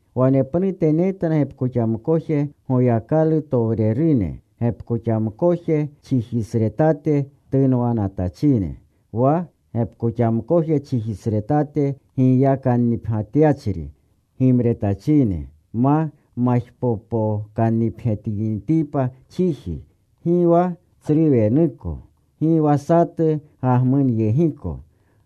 Wanepnute netna gepkoxamkoje Goyakalutowrene, gepkoxamkoje chijisretate tunwanatachine, wa gepkoxamkoje chijisretate giyakannipgyatyachri gimretachine, ma majpopokannipgyatinitipa chiji, gi wa tsru wenuko, gi wa satu gagmunyegiko.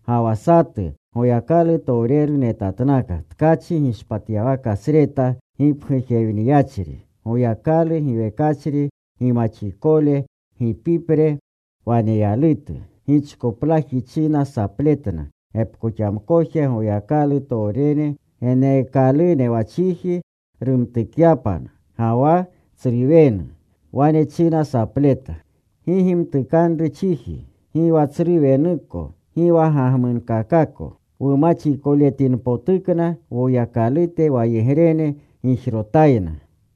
Ga wa satu Goyakalutowreru netatnaka, tkachi gishpatyawakasreta gipgujewniyachri. Goyakalu giwekachri gimaxikole gipipre waneyalutu. Gichkoplaji china sapletna gepkoxamkoje Goyakalutowrene, geneekalune wa chiji rumtukyapna ga wa tsru wenu. Wane china sapleta, “Gi gimtukanru chiji, gi wa tsru wenuko, gi wa gagmunkakako, wumaxikoletinpotukna Woyakalute wayegrene gijrotayna.”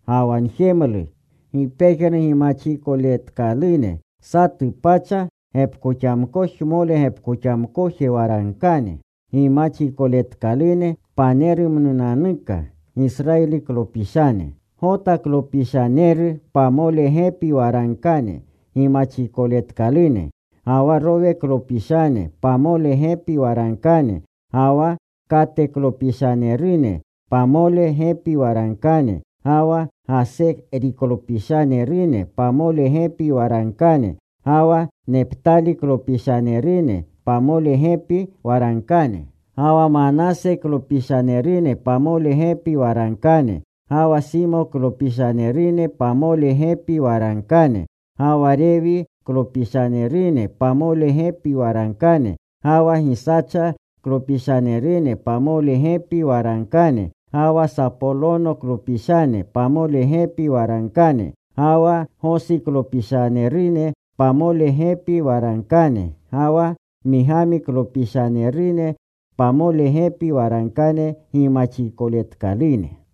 Ga wa njemlu gi pejnu gimaxikoletkalune: satu pacha gepkoxamkojmole gepkoxamkoje waragkane gimaxikoletkalune panerumnunanuka Gisrayiliklopishane. Gotaklopishanerune pamole gepi waragkane gimaxikoletkalune. Ga wa Roweklopishanerune pamole gepi waragkane. Ga wa Kateklopishanerune pamole gepi waragkane. Ga wa Gaseriklopishanerune pamole gepi waragkane. Ga wa Neptaliklopishanerune pamole gepi waragkane. Ga wa Manaseklopishanerune pamole gepi waragkane. Ga wa Simoklopishanerune pamole gepi waragkane. Ga wa Rewiklopishanerune pamole gepi waragkane. Ga wa Gisachaklopishanerune pamole gepi waragkane. Ga wa Sapolonoklopishanerune pamole gepi waragkane. Ga wa Gosiklopishanerune pamole gepi waragkane. Ga wa Migamiklopishanerune pamole gepi waragkane gimaxikoletkalune.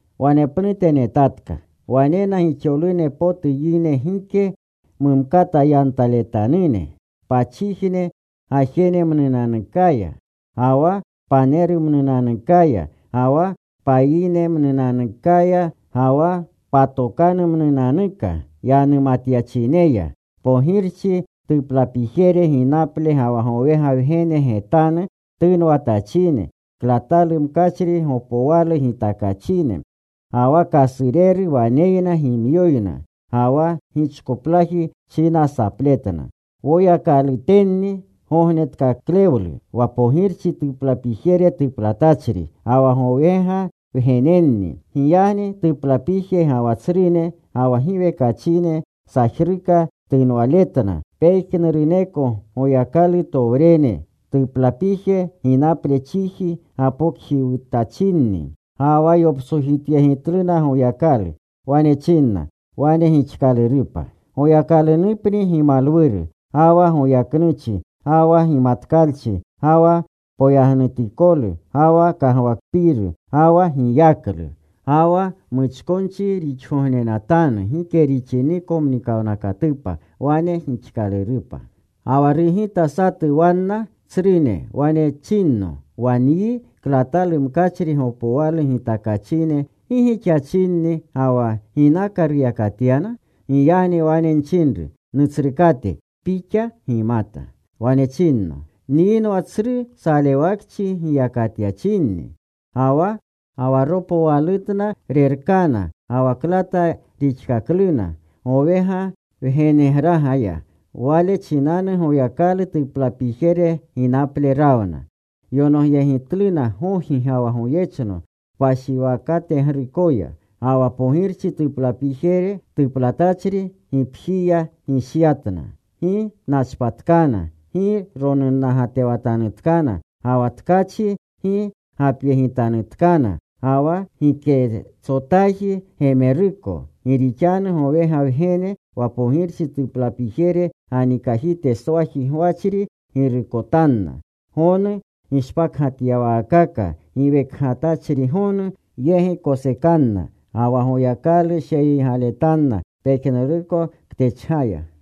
Wanepnute netatka. Wanena gixolune potu yine, gike mumkata yantaletanune, pachijne gajenemnunanukaya, ga wa panerumnunanukaya, ga wa payinemnunanukaya, ga wa patokanumnunanuka yanumatyachineya, pogirchi tuplapijere ginaple ga wa gowega Wgene getanu tunwatachine. Klatalu mkachri gopowalu gitakachine. Ga wa kasureru waneyna gimyoyna. Ga wa gichkoplaji china sapletna: Woyakalutenni gognetkaklewlu wa pogirchi tuplapijere tuplatachri, ga wa gowega Wgenenni. Giyagni tuplapije ga wa tsrune ga wa giwekachine sajruka tunwaletna pejnuruneko Goyakalutowrene. Tuplapije ginaple chiji gapokjiwutachinni. Ga wa yoptsojityegitluna Goyakalu. Wane chinna: “Wane gixkalurupa. Goyakalunupni gimalwuru, ga wa goyaknuchi, ga wa gimatkalchi, ga wa poyagnutikolu, ga wa kagwakpiiru, ga wa giyaklu, ga wa muchkonchi rixgognenatanu gike rixiniko mnikawnakatupa. Wane gixkalurupa.” Ga wa rugita satu wanna tsrune. Wane chinno, “Wa nyi klatalu mkachri gopowalu gitakachine ¿gi gixachinni ga wa ginaka ruyakatyana?” Giyagni wane nchinru, “Nutsrukate, pixa gimata.” Wane chinno, “Nyinwa tsru salewakchi giyakatyachinni. Ga wa ropowalutna rerkana ga wa klata rixkakluna gowega Wgenegragaya. Wale chinanu Goyakalu tuplapijere ginaple rawna. Yonogyegitluna gogi ga wa goyechno kpashiwakategrukoya. Ga wa pogirchi tuplapijere tuplatachri gipjiya gishyatna. Gi nachpatkana. Gi ronunnagatewatanutkana. Ga wa tkachi gi gapyegitanutkana, ga wa giketsotaaji gemeruko. Gi rixanu gowega Wgene wa pogirchi tuplapijere ganikajiteswaji gwachri girukotanna. Gonu gishpakgatyawaakaka giwekgatachrigonu yegi kosekanna. Ga wa Goyakalu sheyiygaletanna pejnuruko ktechgaya.”